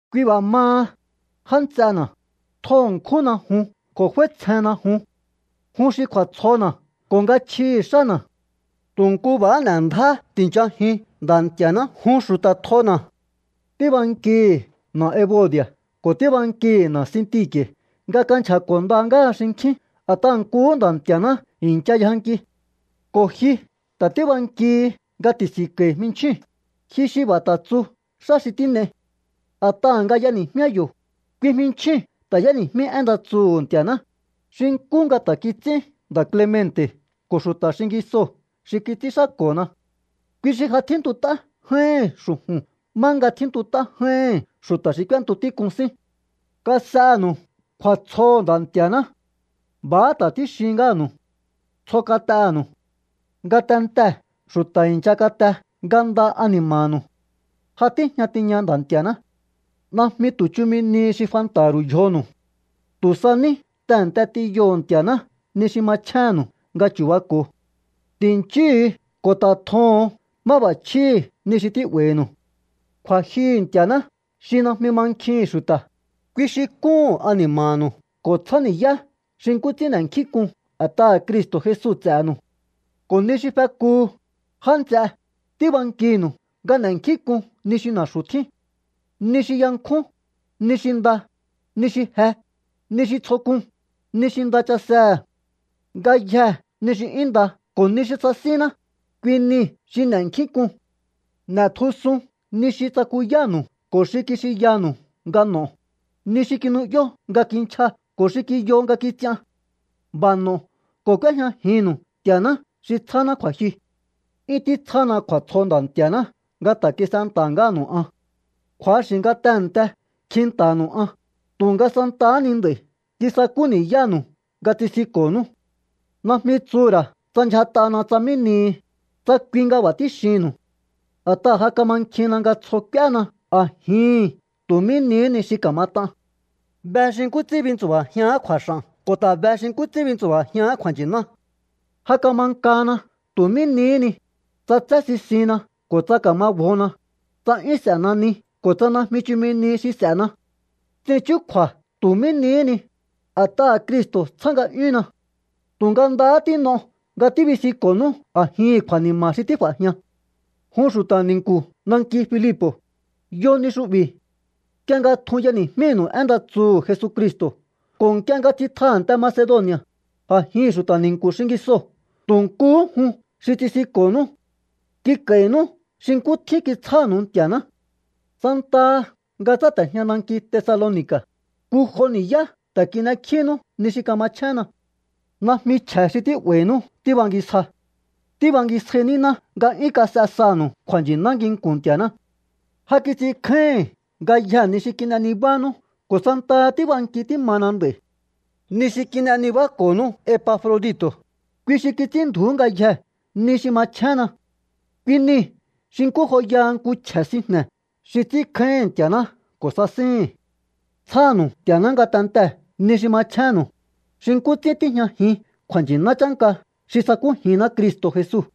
Kui b'a̱ maha, já nts'ena̱, tjo ṉkjúnna jun ko̱ f'áítsjenna jun. Jun xi kju̱a̱tsjona̱ ko̱ nga chjihi̱ xána̱. Tu̱ nku b'a̱ n'e̱ ndjáhá ti̱nchajiun Nda̱ Nti̱a̱ná, jun xu̱ta̱ tjona̱. Tíbankihi̱ na̱ Ebodi̱a̱ ko̱ tíbankihi̱ na̱ Sinti̱ke̱ nga kanchja̱ko̱ nda ngáha xinkjín a̱t'aha̱ nkuhú Nda̱ Nti̱a̱ná i̱ncha yjanki. Ko̱ ji ta̱ tíbankihi nga ti̱si̱nko̱i̱ jminchjíu̱n, ji xi b'a̱ ta̱ tsu xá xi tín'ei. A̱t'aha̱ nga y'eni̱jmíá yo̱, kui jminchjíu̱n ta̱ y'éni̱jmí én nda tsuhu̱ Nti̱a̱ná, xi nkú nga ta̱ kits'ín nda̱ Clemente̱ ko̱ xu̱ta̱ xingisoo̱ xi kits'ínxáko̱na. Kui xi ja tjíntut'á j'áíhi̱n xu̱ju̱n má nga tjíntut'á j'áíhi̱n xu̱ta̱ xi k'úéntu tík'un sín. Kas'enu̱u kju̱a̱tsjoho̱ Nda̱ Nti̱a̱ná. B'a̱há ta̱ tíxin ngáha̱nu̱u. Tsjo kat'enu̱u. Ngatentee̱ xu̱ta̱ i̱ncha kate nga nda ani̱ma̱nu̱u. Ja tíjña tiña Nda̱ Nti̱a̱ná. Najmi tu̱ chumi nihi xi fanta̱ha̱ ru̱u yjonu̱u. Tu̱ sa ní tehe̱nte t'inyoho̱o Nti̱a̱ná ni xi machjénnu̱u nga chu̱bako̱o. Ti̱nchíhu̱u ko̱ ta̱ tjoho̱on máb'a̱chjíhi̱ ni xi tí'ba̱i̱nu̱u. Kju̱a̱jyuhu̱ Nti̱a̱ná xi najmi mankjihi̱n xu̱ta̱, kui xi kúhu̱n ani̱ma̱nu̱u ko̱ tsjáni̱yá xi nkú ts'ín n'e̱nkjínk'un a̱t'aha̱ Cristo̱ Jesu ts'e̱nu̱u. Ko̱ ni xi fekuhu, já nts'e, tíbankinu̱u nga n'e̱nkjínk'un ni xi na̱xu̱ tjín, ni xi yankjún, ni xi nda, ni xi je, ni xi tsjo k'un, ni xi nda chasehe̱. Ngayjee̱ ni xi 'yún nda ko̱ ni xi sasínná, kui nii̱ xi n'e̱nkjínk'un. N'e̱tjusun ni xi tsakuyánu̱u ko̱ xi kixinyanu̱u nga n'o̱o, ni xi kinu'yó nga kinchja ko̱ xi kiyo nga kits'ian. B'a̱ n'o̱o ko̱ k'úéjñajinnu̱u Nti̱a̱ná xi tsjáná kju̱a̱jyu. 'Yún títsjána kju̱a̱tsjo Nda̱ Nti̱a̱ná nga ta̱ kis'enta̱há ngáha̱nu̱u an. Kju̱axi̱ nga tehe̱nte kjinta̱ha̱nu̱u an, tu̱nga santahá ni nd'a̱i̱ kisakú ni̱yánu̱u nga tsisinko̱nú. Najmi tsuhu̱ ra̱ tsa ndyjat'ana tsa mí nihi, tsa kui nga b'a̱ tíxihi̱nnu̱u. A̱t'aha̱ ja kamankjinna nga tsjo k'úéna a̱jihi̱n tu̱ mí nihí ni xi ka̱mat'an. Be xi nkú ts'ín bintsu̱ba̱jián kju̱a̱x'a̱n ko̱ ta̱ be xi nkú ts'ín bintsu̱ba̱jián kju̱a̱nchi̱ná. Ja kama nkana tu̱ mí nihí ni, tsa tsé sisinna ko̱ tsa ka̱ma bjona, tsa 'yún s'e̱na ni ko̱ tsa najmi chumi nihi xi s'e̱na. Ts'in chúkju̱a̱ tu̱ mí nihí ni, a̱t'aha̱ Cristo̱ tsjá nga'yúnna. Tu̱nga ndahá tín'o nga tíbisinko̱nú a̱jihi̱n kju̱a̱ni̱ma̱ xi tíf'a̱jian. Jun xu̱ta̱ ni̱nku̱ nanki Filipo̱, yo ni xu'bi̱. Nk'ie nga tjun y'eni̱jmínu̱u én nda tsuhu̱ Jesucristo̱ ko̱ nk'ie nga tsitja a̱nte Macedoni̱a̱, a̱jihi̱n xu̱ta̱ ni̱nku̱ xingisoo̱ tu̱ nkuhú jun xi tsisinko̱nú. Kik'a̱i̱nú xi nkú tjín kitsjánu̱u Nti̱a̱ná. Santaha nga tsáte̱jña nanki Tesaloni̱ka̱, nku jo ni̱yá ta̱ kin'ekjínú ni xi kamachjénna. Najmi chje̱ xi tí'ba̱i̱nú tíbangisja. Tíbangisja níná nga 'yún kas'e sanu̱u kju̱a̱nchi̱ná nginku̱n Nti̱a̱ná. Ja kits'inkjáíhi̱n ngayjee̱ ni xi kin'e nibánú ko̱ santaha tíb'anki tímana nd'a̱i̱. Ni xi kin'e nibáko̱nú Epafrodito̱, kui xi kits'ínndju̱ú ngayjee̱ ni xi machjénna. Kui niu̱ xi nkú joyaha nku chje̱ sinjne̱ xi ts'ínkjáíhi̱n Nti̱a̱ná ko̱ sasíhi̱n. Tsjánu̱u Nti̱a̱ná ngatentee̱ ni xi machjénnu̱u, xi nkú ts'ín tíjñajin kju̱a̱nchi̱ná chánka xi sakújinná Cristo̱ Jesu.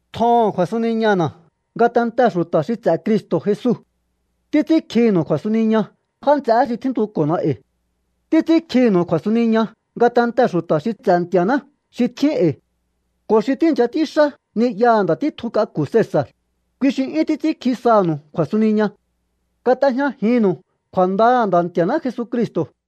Tjoho̱on kju̱a̱suniñana̱ ngatentee̱ xu̱ta̱ xi ts'e̱ Cristo̱ Jesu. Títs'ínkjinu̱u kju̱a̱suniña já nts'eé xi tjíntuko̱na e̱i̱. Títs'ínkjinu̱u kju̱a̱suniña ngatentee̱ xu̱ta̱ xi ts'e̱ Nti̱a̱ná xi tjín e̱i̱. Ko̱ xi tíi̱ncha ts'ínxá ni'yaha̱ nda̱ títjun k'aku̱ Cesa̱r, kui xi 'yún títs'ínkji sanu̱u kju̱a̱suniña. Kat'ejñajinnu̱u kju̱a̱ndaha̱ Nda̱ Nti̱a̱ná Jesucristo̱.